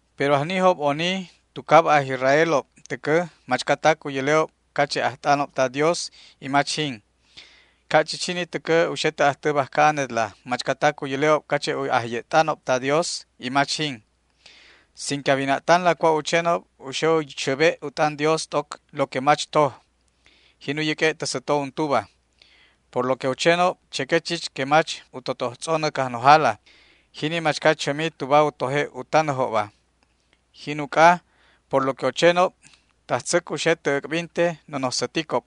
Pero ajnijob oni tu cab aj Israelob täcä machcatac u yäle'ob cache' ajt'anob ta Dios y mach jin. Ca' chich jini täcä u xe tä ajtä bajca anetla machcatac u yäle'ob cache' ajye't'anob ta Dios y mach jin. Sin que a wina'tanla cua' u chenob u xe u xäbe' u t'an Dios t'oc lo que mach toj, jin u yäq'ue' tä säto untuba. Por lo que u chenob cheque chich que mach u totoj tz'onän Cajnojala, jini machca chämi tuba u toje' u tanäjobba. Jin uc'a, por lo que u chenob, tajtzäc u xe tä äc'binte nonoj säticob.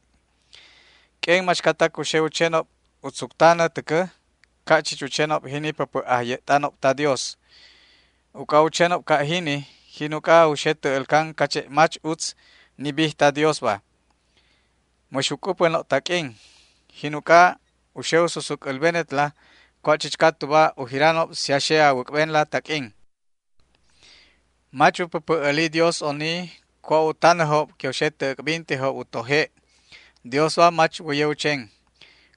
Q'uen machcatac u xe u chenob u tzuc tanä täcä ca' chich u chenob jini päpä' ajye't'anob ta Dios. Uc'a u chenob ca' jini jin uc'a u xe tä älcan cache' mach utz ni bij ta Diosba. Mäx u c'upänob taq'uin. Jin uc'a u xe u susuc älbenetla cua' chichca tuba u jiranob si a xe a wäc'benla taq'uin. Mach u päpä' äli Dios oni cua' u tanäjob que u xe tä äc'bintejob u toje'. Diosba mach wäye u chen.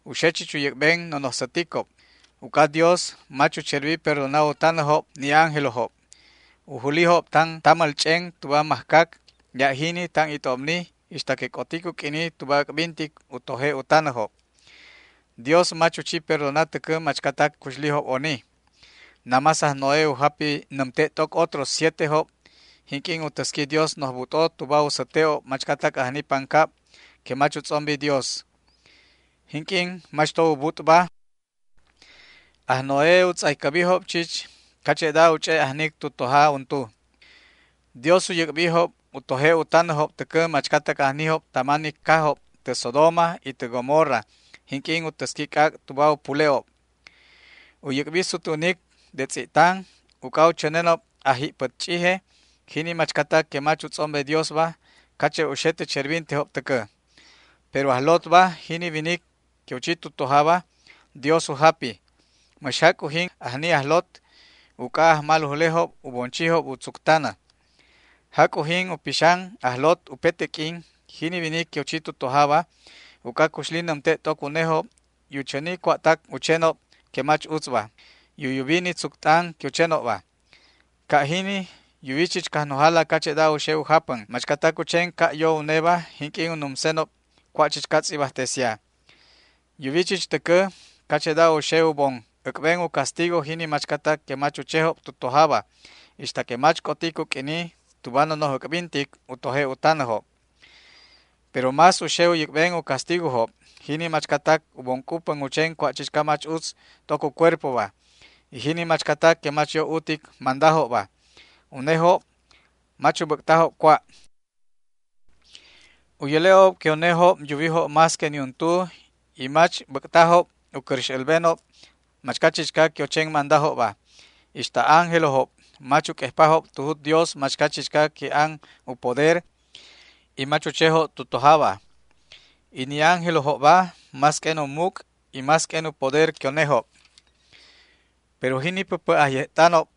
U xe chich u yäc'ben nonoj säticob. Uc'a Dios mach u cherbi perdona u tanäjob ni ángelojob. U julijob tan tamäl ch'en tuba mäjcac ya' jini tan it'obni ixta que c'otic u q'uini tuba äc'bintic u toje' u tanäjob. Dios mach u chi perdona täcä machcatac cuxlijob oni. Namás aj Noé u japi nämte' t'oc otros sietejob jinq'uin u täsqui Dios noj but'o tuba u säte'ob machcatac ajni pancab que mach u tz'ombi Dios. Jinq'uin mach to ubut'ba, aj Noé u tz'aycäbijob chich cache'da u ch'e' ajnic tu toja untu. Dios u yäc'bijob u toje' u tanäjob täcä machcatac ajnijob tama ni cajob tä Sodoma y tä Gomorra jinq'uin u täsqui c'ac' tuba u pule'ob. U yäc'bi sutwänicob de tz'i'tan uc'a u chänenob ajji'pät ch'ije, jini machcatac que mach u tz'ombe Diosba, cache' u xe tä cherbintejob täcä. Pero aj Lotba, jini winic que u chi tu tojaba, Dios u japi. Mäx jac' ujin ajni aj Lot, uc'a ajmalujlejob u bon chijob u tzuc tanä. Jac' ujin u pixan aj Lot upete q'uin, jini winic que u chi tu tojaba, uc'a cuxli nämte' t'oc unejob y u chäni cua'tac u chenob que mach utzba, y u yubi ni tzuc t'an que u chenobba. Ca' jini yuwi chich Cajnojala cache'da u xe u japän machcatac u chen ca' yo uneba jinq'uin u numsenob cua' chichca tz'ibajtesia. Yuwi chich täcä cache'da u xe u bon äc'ben u castigo jini machcatac que mach u chejob tu tojaba, ixta que mach c'otic u q'uini tuba nonoj äc'bintic u toje' u tanäjob. Pero más u xe u yäc'ben u castigojob jini machcatac u bon c'upän u chen cua' chichca mach utz t'oc u cuerpoba, y jini machcatac que mach yo utic mandajobba. Unejob mach u bäc'tajob cua'. U yäle'ob que unejob yuwijob más que niuntu y mach bäc'tajob u cäräx älbenob machca chichca que u chen mandajobba. Ixta ángelojob mach u q'uejpajob tu jut Dios machca chichca que an u poder y mach u chejob tu tojaba. Y ni ángelojobba más q'uen u muc' y más q'uen u poder que unejob. Pero jini päpä' ajye't'anob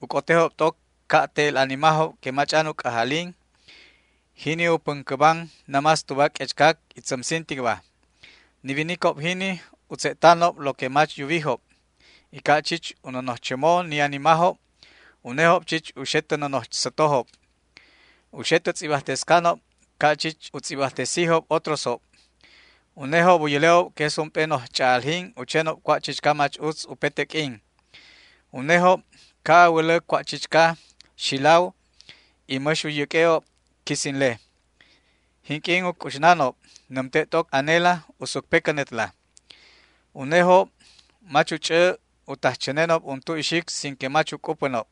u c'otejob t'oc ca' te'el animajob que mach'an u c'ajalin, jini u päncäban namás tuba q'uechcac y tzämsinticba. Ni winicob jini u tze'tanob lo que mach yuwijob, y ca' chich u nonoj chämo ni animajob, unejob chich u xe tä nonoj sätojob. U xe tä tz'ibajtescanob ca' chich u tz'ibajtesi otrosjob. Unejob u yäle'ob que es ump'e noj ch'a'aljin u chenob cua' chichca mach utz upete q'uin. Unejob ca' a wälä cua' chichca xilaw y mäx u yäq'ue'ob quisinle. Jinq'uin u c'uxnanob nämte' t'oc anela u sucpecänetla. Unejob mach u ch'ä u taj chänenob untu ixic sin que mach u c'upänob.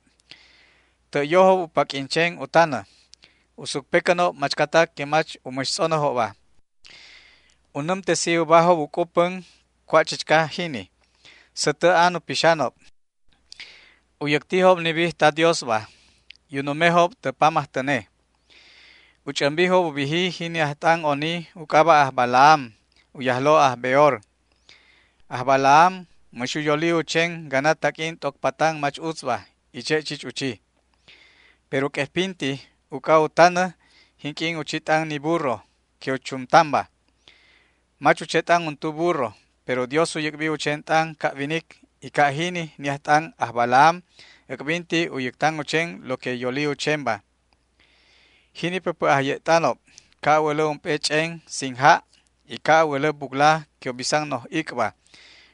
Tä' yojob u paq'uin chen u tanä. U sucpecänob machcatac que mach u mäx tz'onäjobba. U nämtesi ubajob u c'upän cua' chichca jini. Sätä an u pixanob. U yäctijob ni bij ta Diosba y u numejob tä pamajtäne. U ch'ämbijob u biji jini ajt'an oni u c'aba' aj Balaam, u yajlo' aj Beor. Aj Balaam mäx u yoli u chen gana taq'uin t'oc patan mach utzba, y che' chich u chi. Pero q'uejpinti uc'a u tanä jinq'uin u chi t'an ni burro que u chumtanba. Mach u che t'an untu burro, pero Dios u yäc'bi u chen t'an ca' winic, y ca' jini ni ajt'an aj Balaam äc'binti u yäctan u chen lo que u yoli u chenba. Jini päpä' ajye't'anob ca' a wälä ump'e ch'en sin ja' y ca' a wälä bucla que u bisan noj ic'ba,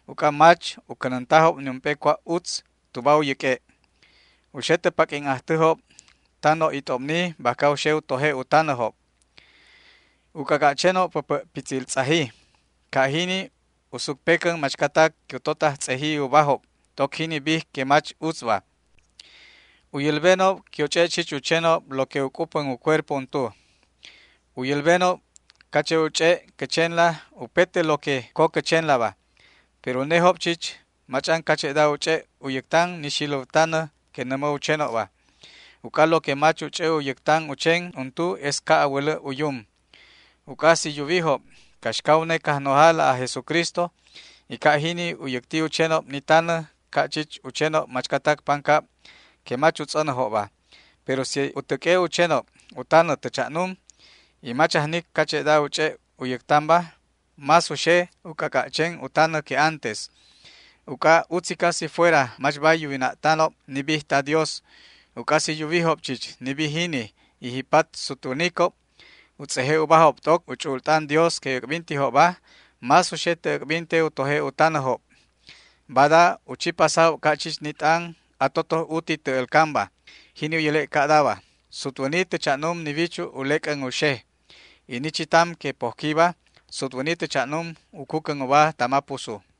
uc'a mach u cänäntajob niump'e cua' utz tuba u yäq'ue'. U xe tä paq'uin ajtäjob tan noj it'obni bajca u xe u toje' u tanäjob. U c'ac'a' chenob päpä' pitzil tz'aji. Ca' jini u sucpecän machcatac que u totaj tz'eji ubajob t'oc jini bij que mach utzba. U yälbenob que u ch'e' chich u chenob lo que u c'upän u cuerpo untu. U yälbenob cache' u ch'e' cä chenla upete lo que co cä chenlaba, pero unejob chich mach'an cache'da u ch'e' u yäctan ni xiläw tanä que nämä u chenobba. Uc'a lo que mach u ch'ä u yäctan u chen untu es ca' a wälä u yum. Uc'a si yuwijob caxca une Cajnojala aj Jesucristo, y ca' jini u yäcti u chenob ni tanä ca' chich u chenob machcatac pancab que mach u tz'onäjobba, pero si u täq'ue' u chenob u tanä tä cha'num y mach ajnic cache'da u ch'e' u yäctanba, más u xe u c'ac'a' chen u tanä que antes. Uc'a utzica si fuera mach bay yuwina'tanob ni bij ta Dios, uc'a si yuwijob chich ni bij jini, y ji'pat sutwänicob u tz'eje' ubajob t'oc u ch'u'ul t'an Dios que äc'bintijobba, más u xe tä äc'binte u toje' u tanäjob. Bada u chi pasajob ca' chich ni t'an atotoj uti tä älcanba, jini u yäle' ca'daba: “Sutwäni tä cha'num ni wichu' u lec'än u xej, y ni chitam que pojquiba sutwäni tä cha'num u cucän uba tama pusu”.